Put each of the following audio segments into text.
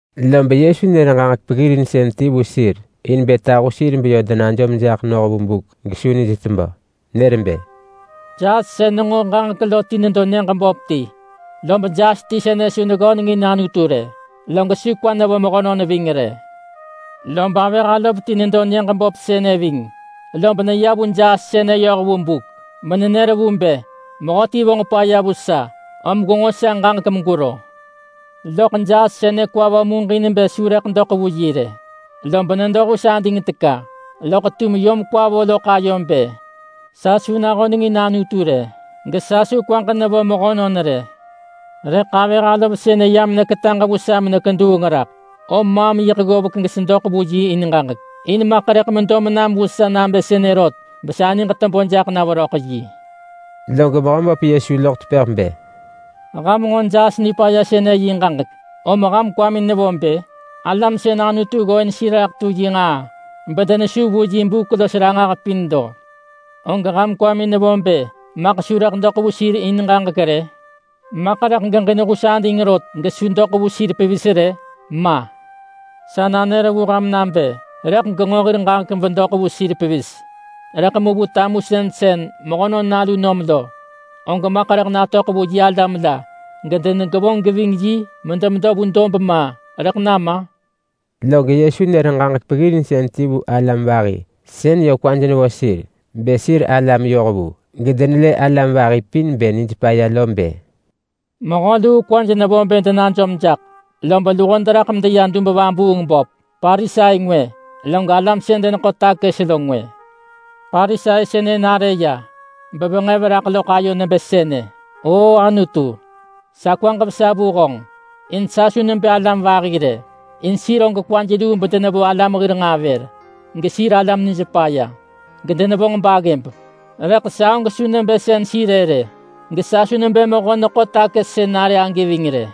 Lob Yesu nër ġaġek peggirinsën ti vu sir in bë tahu sir beyö denajom jaḳ noh vu buk gesu nij tebö. Nër bë, “Jaas sën nenġo ġaġek lo ti nedo nyëġ böp ti. Lob jaas ti sënë su neggönengin Anutu rë, log su kwa nevo mehönon ving rë. Lob avëh alov ti nedo nyëġ böp sënë ving. Lob neya vu jaas sënë yoh vu buk menenër vu bë, ‘Mehöti vonġ paya vu sa, om gwenġo sa ġaġek megwero.’ Loḳ jaas sënë kwa vo muġin bë su rëḳ doḳ vu yi rë, lob nedo hus ading teka. Loḳ tum yom kwa vo loḳ ayo bë, ‘Sa su nahönengin Anutu rë, gesa su kwaġ nevo mehönon rë. Rëḳ avëh alov sënë yam neketaġ vu sa mekeduung raḳ, om maam yiḳ ggovek gesedoḳ vu yi in ġaġek. In maḳ rëḳ medo menam vu sa nabë sënë rot besa niġ tebö jaḳ na veröḳ yi.’” Log Mehöböp Yesu loḳ tepëḳ bë, “Ham nġo jaas nipaya sënë yi ġaġek, om ham kwamin nevo bë? Alam sën Anutu ggooin sir raḳ tu yi nġaa bedenesu vu yi buk los ranġah pin lo, og ham kwamin nevo bë maḳ su rëḳ doḳ vu sir in ġaġek rë? Maḳ rëḳ geġin hus ading rot, gesu doḳ vu sir pevis rë? Ma. Sa nanër vu ham nabë: Rëḳ genġo hir ġaġek bedoḳ vu sir pevis. Rëḳ mu vu tamusën sën Mehönon Nalu nom lo, og maḳ rëḳ natöḳ vu yi alam la gedenegevonġ geving yi medemedo ma rëḳ nama?” Log Yesu nër ġaġek peggirinsën ti vu alam vahi sën yö kwaj nevo sir bë sir alam yohvu gedenelë alam vahi pin bë nij paya lo bë, “Mehö luu kwaj nevo bë denajom jaḳ, lob luho deraḳ medeya dub vabuung böp. Parisai ngwë, log alam sën deneḳo takës lo ngwë. Parisai sënë nare ya, bevenġev raḳ loḳ ayo nebë sënë, ‘Oo Anutu, sa kwaġ vesa vu honġ, in sa su nebë alam vahi rë. In sir og kwaj luu bedenevo alam hir nġaa vër. Gesir alam nij paya, gedenevonġ baggëb. Rëḳ sa og su nebë sën sir-ë rë. Gesa su nebë mehö neḳo takës sën nare agi ving rë.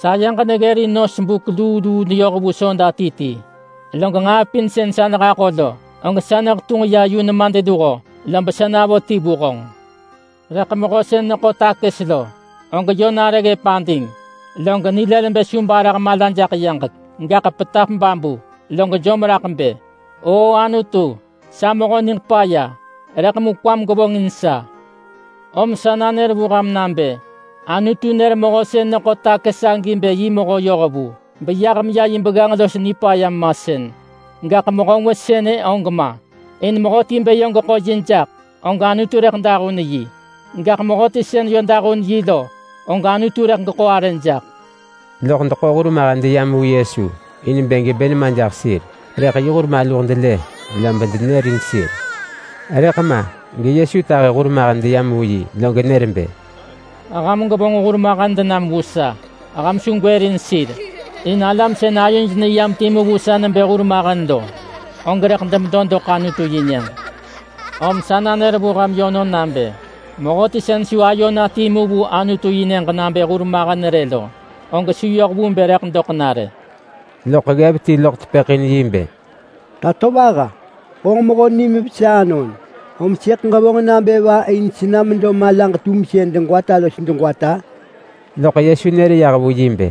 Sayeġ neggërin nos buk luu luu neyoh vu soda ti ti. Log nġaa pin sën sa nehaḳo lo, og sa nehetunġ ya yu nemadluho, lob sa navo ti vu honġ.’ Rëḳ mehö sën neḳo takës lo, og yö nare ggëp ading, log nilël bë su barah mala jaḳ yaġek, gaḳ petap babu log jom raḳ bë, ‘Oo Anutu, sa mehö niġ paya, rëḳ mu kwam gevonġin sa!’ Om sa nanër vu ham nabë: Anutu nër mehö sën neḳo takës agi bë yi mehö yohvu beyah meya yi begganġ los nipaya masën. Gaḳ mehö ngwë sënë og ma. In mehöti bë yö geḳo yi jaḳ, og Anutu rëḳ dahun yi. Gaḳ mehöti sën yö dahun yi lo, og Anutu rëḳ geḳo arë jaḳ.” Loḳ deḳo hurmahen deyam vu Yesu, in bë gebë nema jaḳ sir. Rëḳ yi hur maluh delë, lob denërin sir. Rëḳ ma geYesu tahi hurmahen deyam vu yi, log nër bë, “Ham gwevonġ hurmahen denam vu sa. Ham su gwërin sir, in alam sën ayoj neyam timu vu sa nebë hurmahen lo, og rëḳ demedo doḳ Anutu-yi-nyëġ. Om sa nanër vu ham yönon nabë: Mehöti sën su ayo na timu vu Anutu-yi-nyëġ nabë hurmahen rë lo, og su yoh vu bë rëḳ doḳ na rë.” Loḳ ggev ti loḳ tepëḳ in yi bë, “Tatovaha! Honġ mehö nim vesa anon, om sëḳ ġevonġ nabë va in sena medo malaġ-tumsën degwata los degwata?” Loḳ Yesu nër yah vu yi bë,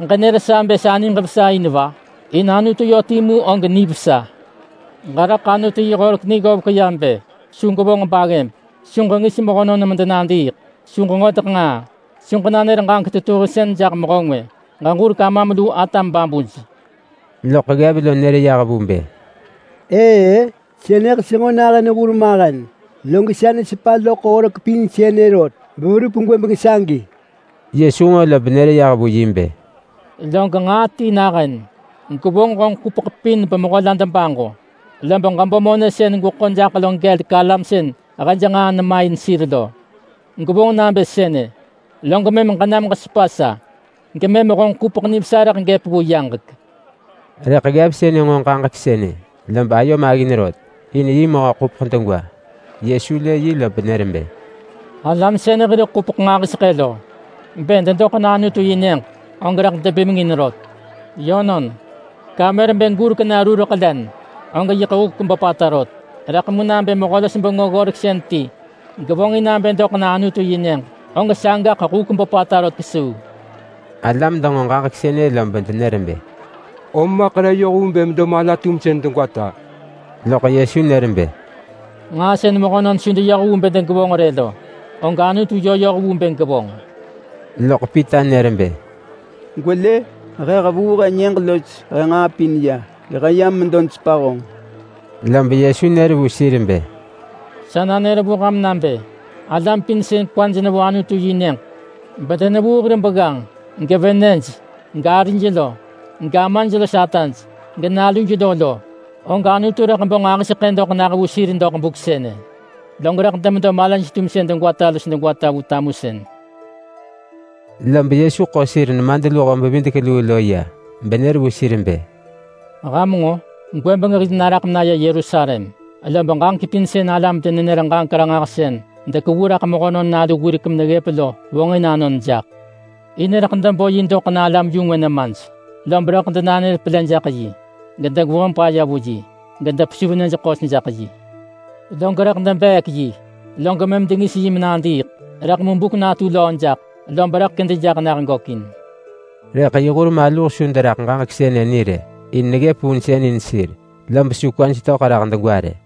“Ġenër sa bë sa niġ vesa in va? In Anutu yö timu og nivesa. Ġeraḳ Anutu yi horek ni ggovek ya bë: Su gwevonġ baggëb. Su ġengis mehönon medenadiiḳ. Su ġeġodeḳ nġaa. Su ġenanër ġaġek tetuhinsën jaḳ mehö ngwë. Ġeġurek amam lu atam babuj.” Loḳ ggev lo nër yah vu bë, “Ëë-ë, sënëḳ senġo nahën hurmahen, log sa nesepa loḳ horek pin sënë rot beverup gwëbeng sagi.” Yesu nġo lob nër yah vu yi bë, “Log nġaa ti nahën. Gwevonġ honġ ḳupeḳ pin bemehö la debaġo, lob ġebo monë sën gweḳo jaḳ lo gelek alam sën hej nġaa nema in sir lo. Gwevonġ nabë sënë log mëm ġenam ġesepa sa, gemëm honġ ḳupeḳ nivesa rëḳ gëp vu yaġek.” Rëḳ ggev sënë nġo ġaġek sënë, lob ayo maggin rot. In yi mehö ḳupeḳ degwa. Yesu lë yi lob nër bë, “Alam sën hir ḳupeḳ nġahiseḳë lo, bë dedoḳ na Anutu-yi-nyëġ og rëḳ debimengin rot. Yönon, kamer bë gurek na rureḳ len, og yiḳ huk böpata rot, rëḳ mu nabë mehö-los-bengö-ggoreksën ti gevonġ in nabë doḳ na Anutu yi nyëġ og sagaḳ huk böpata rot kesuu.” Alam denġo ġaġek sënë lob denër bë, “Om maḳ re yoh vu bë rëḳ medo mala-tumsën degwata?” Loḳ Yesu nër bë, “Nġaa sën mehönon su deyoh vu bë degevonġ rë lo, og Anutu yö yoh vu bë gevonġ.” Loḳ Pita nër bë, “Gwelë! He hevuu he nyëġ los he nġaa pin ya, gehe yam medo nesepa honġ.” Lob Yesu nër vu sir bë, “Sa nanër vu ham nabë: Alam pin sën kwaj nevo Anutu-yi-nyëġ, bedenevuu hir begganġ, gevenëj, garij lo, gamaj los ataj, genaluj lo lo, og Anutu rëḳ bo nġahiseḳë doḳ nah vu sir doḳ buk sënë, log rëḳ demedo malaj-tumsën degwata los degwata vu tamusën.” Lob Yesu ḳo sir nemadluho-bevidek-luu lo ya, benër vu sir bë, “Ham nġo! Gwëbeng hil naraḳ menaya Yerusalem. Lob ġaġek pin sën alam-denenër-ġaġek-ranġahsën dekevu raḳ Mehönon Nalu wirek meneggëp lo vonġin anon jaḳ. In rëḳ debo yi doḳ na alam-yu-ngwë nemaj. Lob rëḳ denanër pelë jaḳ yi, gedegevonġ paya vu yi, gedepesuv nyëj ḳos jaḳ yi. Log rëḳ debeek yi, log mëm dengis yi menadiiḳ. Rëḳ mu buk natu löö jaḳ, lob rëḳ kedi jaḳ nah gökin.” Rëḳ yi hur maluh su deraḳ ġaġek sënë ni rë. In neggëp vunsën in sir lob su kwaj töḳ raḳ degwa rë.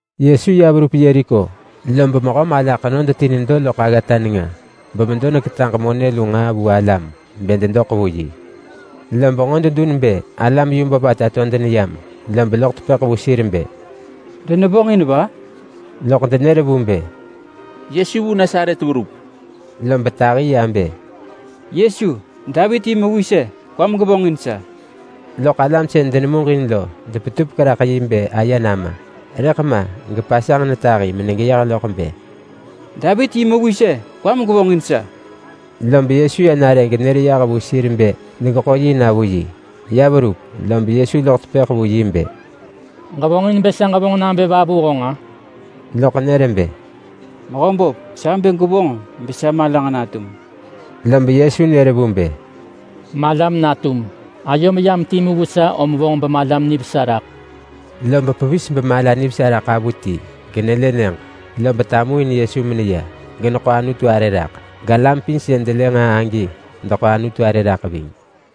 Yesu ya verup Yeriko, lob mehö mala ḳenod ti nedo loḳ aggata nenga bemedo neketaġ monë lu nġaa vu alam bë dedoḳ vu yi. Lob nġo dedun bë alam yu böpata to deneyam, lob loḳ tepëḳ vu sir bë, “Denevonġ va?” Loḳ denër vu bë, “Yesu vu Nasaret verup.” Lob tahi ya bë, “Yesu! Davit yi mewis-e! Kwam gevonġin sa.” Loḳ alam sën denemuġin lo depetupek raḳ yi bë aye nama. Rëḳ ma gepasanġ netahi menegeyeh loḳ bë, “Davit yi mewis-e! Kwam gevonġin sa!” Lob Yesu ya nare genër vu sir bë degeḳo yi na vu yi. Ya verup, lob Yesu loḳ tepëḳ vu yi bë, “Ġevonġin bë sa ġevonġ nabë va vu honġ-a?” Loḳ nër bë, “Mehöböp, sa bë gwevonġ besa malaġ natum gökin.” Lob Yesu nër vu bë, “Malam natum. Ayom yam timu vu sa om vonġ bemalam nivesa raḳ.” Lob pevis bemala nivesa raḳ avuti genelë nyëġ. Lob tamuin Yesu meneya, geneḳo Anutu arë raḳ. Galam pin sën delë nġaa agi deḳo Anutu arë raḳ ving.